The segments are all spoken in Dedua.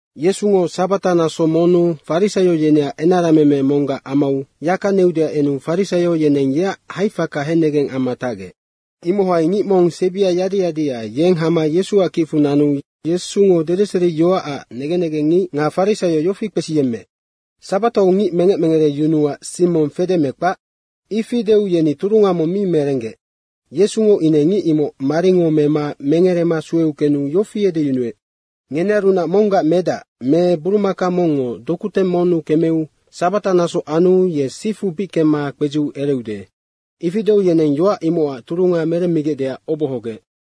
Yesungo sabata naso monnu farisaio yeneac enarameme monggac amau yaka neudeac enu farisaio yeneng yeac haifaka hennegeng amma tacgec. Imohai ngic mong sebia yadi yadia, yeng hama Yesuac kicfu nanu Yesungo dedeseriyoacac negen negengngic nga farisaio yofi kpesiyemmeec, “Sabatau ngic mengec mengereyunuac sing mong fede me kpac?” Ifi deu yeni turunga mong mi merenggec Yesungo ine ngic imoc maringo mema mengerema sueu kenu yofi edeyunuec, “Ngenearunac monggac medac me burumaka mongngo dokuteng monnu kemeu sabata naso anu ye sifu bic kemma kpedziu ereude.” Ifi deu yeneng yoac imocac turunga meremmigecdeac obohogec.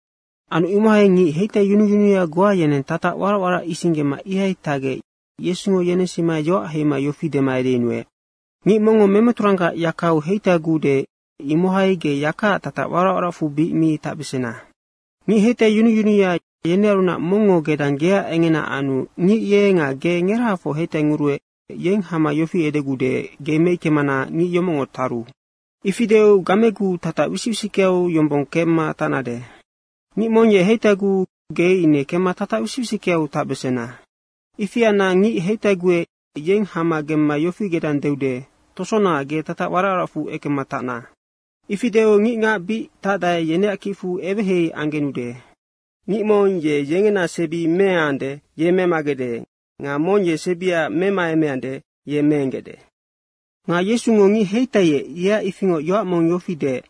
Anu imohai ngic heitaiyunuyunuya goa yeneng tatac warac warac isinggema ihai tacgec Yesungo yenensima yoac heima yofi dema edeyunuec, “Ngic mongngo memeturanggac yakau heitaiguude, imohai ge yakaac tatac warac waracfu bic mi tacbesena. Ngic heitaiyunuyunuya, yenearunac mongngo gedang geac engena anu ngic ye nga ge ngerahafoc heitainguruec, yeng hama yofi edeguude, ‘Ge meickemana ngic yomocngo taru.’ Ifi deu gameguu tatac wisic wisickeau yombong kemma tacnade. Ngic mong heitaiguu ge ine kemma tatac wisic wisickeau tacbesena. Ifi anna ngic heitaiguec, yeng hama gemma yofi gedang deude, ‘Tosona, ge tatac warac waracfu ekemma tacna.’ Ifi deu ngicngac bic tacdae, yeneac kicfu eweheihei anggenude. Ngic mong ye yengena sebi meengande, ye memagecde nga mong ye sebia memaemeande, ye meenggecde.” Nga Yesungo ngic heitaiec, yeac ifingoc yoac mong yofi deec,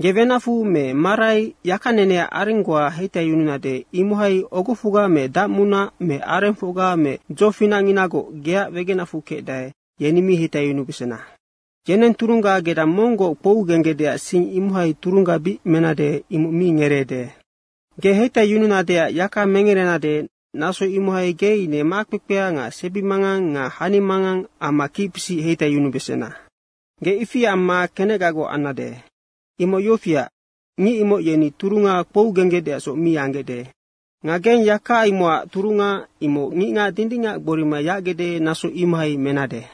“Ge wenacfu me marai yakaneneac areng goa heitaiyununade, imohai ogofocga me dacmunac me arengfocga me dzofinacnginagoc geac wegenacfu kecdae, yeni mi heitaiyunubesena. Yeneng turunga gedang monggoc kpougenggec sing imohai turungga bic menade, imoc mi ngereede. Ge heitaiyununadeac yaka mengerenade, naso imohai ine ngic makpekpea nga sebimangang nga hanimangang amma kicpisic heitaiyunubesena. Ge ifi amma kenecgagoc annade. Imoc yofiac, ngic imoc yeni turunga kpougenggecdeacsoc mi anggecde. Nga geng yaka imocac turunga imoc ngicngac dindingac gborima yacgecde, naso imohai menade.”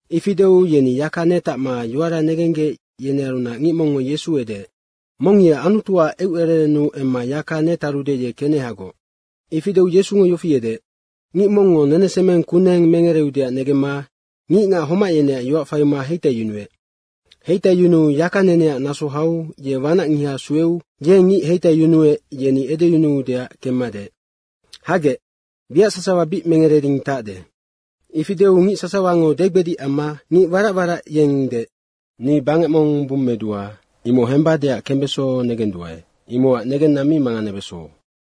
Ifi deu yeni yaka netacma yoara negenggec yenearunac ngic mongngo Yesu edeec, “Mong ye Anutuac eucererennu emma yaka netarude, ye kenehagoc.” Ifi deu Yesungo yofi edeec, “Ngic mongngo nenesemeng kuneng mengereudeac negemma ngicngac homac yeneac yoac faima heitaiyunuec. Heitaiyunuu yakaneneac naso hau ye wanacngiha sueu yeng ngic heitaiyunuec, yeni edeyunuudeac kemma deec, ‘Hagec, wiac sasawa bic mengereding tacde.’ Ifi deu ngic sasawango degbedic amma ngic warac warac yeng deec, ‘Ni bangec mong bummedua, imoc hembadeac kembeso negenduae, imocac negenna mi manganebeso.’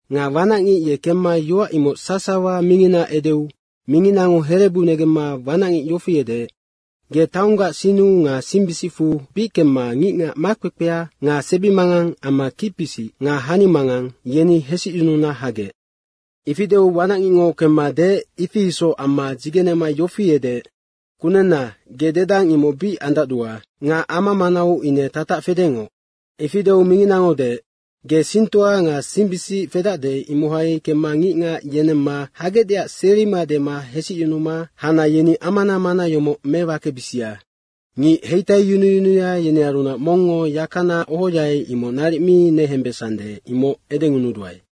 Nga wanacngic ye kemma yoac imoc sasawa mingina edeu minginango herebu negemma wanacngic yofi edeec, ‘Ge taonggac sinnu nga singbisicfu bic kemma ngicngac makpekpea nga sebimangang amma kicpisic nga hanimangang, yeni hesicyununa hagec.’ Ifi deu wanacngicngo kemma deec, ifi isoc amma dzigenema yofi edeec, ‘Kunenna, ge dedang, imoc bic andacdua nga ama manau ine tatac fedengoc.’ Ifi deu minginango deec, ‘Ge singtoa nga singbisic fedacde, imohai kemma ngicngac yenemma hagecdeac serima dema hesicyunuma hana yeni amana mana yomoc mewakebisia. Ngic heitaiyunuyunuya, yenearunac mongngo yakana ohoai, imoc naric mi nehembesande, imoc edengunuduae.’”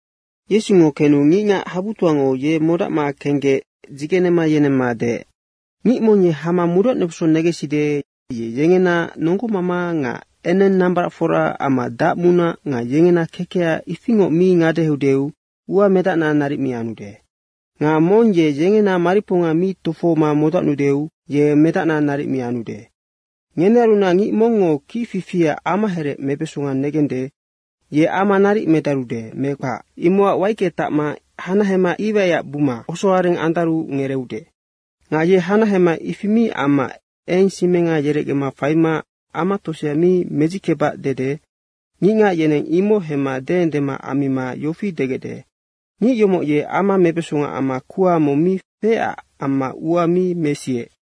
Yesungo kenu ngicngac habutoango ye modacma kenggec dzigenema yenemma deec, “Ngic mong ye hama modacnubeso negenside, ye yengena nonggomama nga eneng nambaracfora amma dacmunac nga yengena kekeha ifingoc mi ngadeheudeu ua medacna naric mi anude. Nga mong ye yengena mariponga mi tofohoma modacnuudeu ye medacna naric mi anude. Ngenearunac ngic mongngo kicfifiac amaherec mebesonga negende, ye ama naric medarude me kpac, imocac waicke tacma hanahema iwaiac buma osoareng andarudeu ngereeude. Nga ye hanahema ifi mi amma eng simenga yerecgema faima ama tosea mi medzickebac dede ngicngac yeneng imoc hemma deendema ammima yofi degecde, ‘Ngic yomoc ye ama mebesonga amma kuha mong mi feecac ama ua mi mesiec.’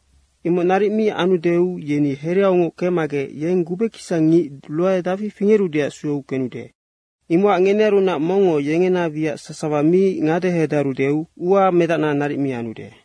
Imoc naric mi anudeu yeni hereaungoc kecmagec yeng gubekisang ngic ruae dafi fingerudeac sueu kenude. Imocac ngenearunac mongngo yengena wiac sasawa mi ngadehedarudeu ua medacna naric mi anude.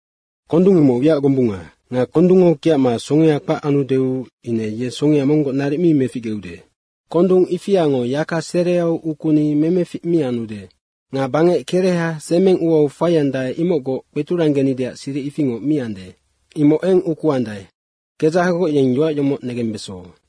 Kondung imoc wiac gombunga. Nga kondungngo kiacma songea kpac anudeu ine ye songea monggoc naric mi meficgeude. Kondung ifiango yaka sereau ukuni memefic mi anude nga bangec kereha semeng uau faiandae, imocgoc kpeturanggenideac siric ifingoc mi ande. Imoc eng ukuandae. Kedzahagoc yeng yoac yomoc negembeso.”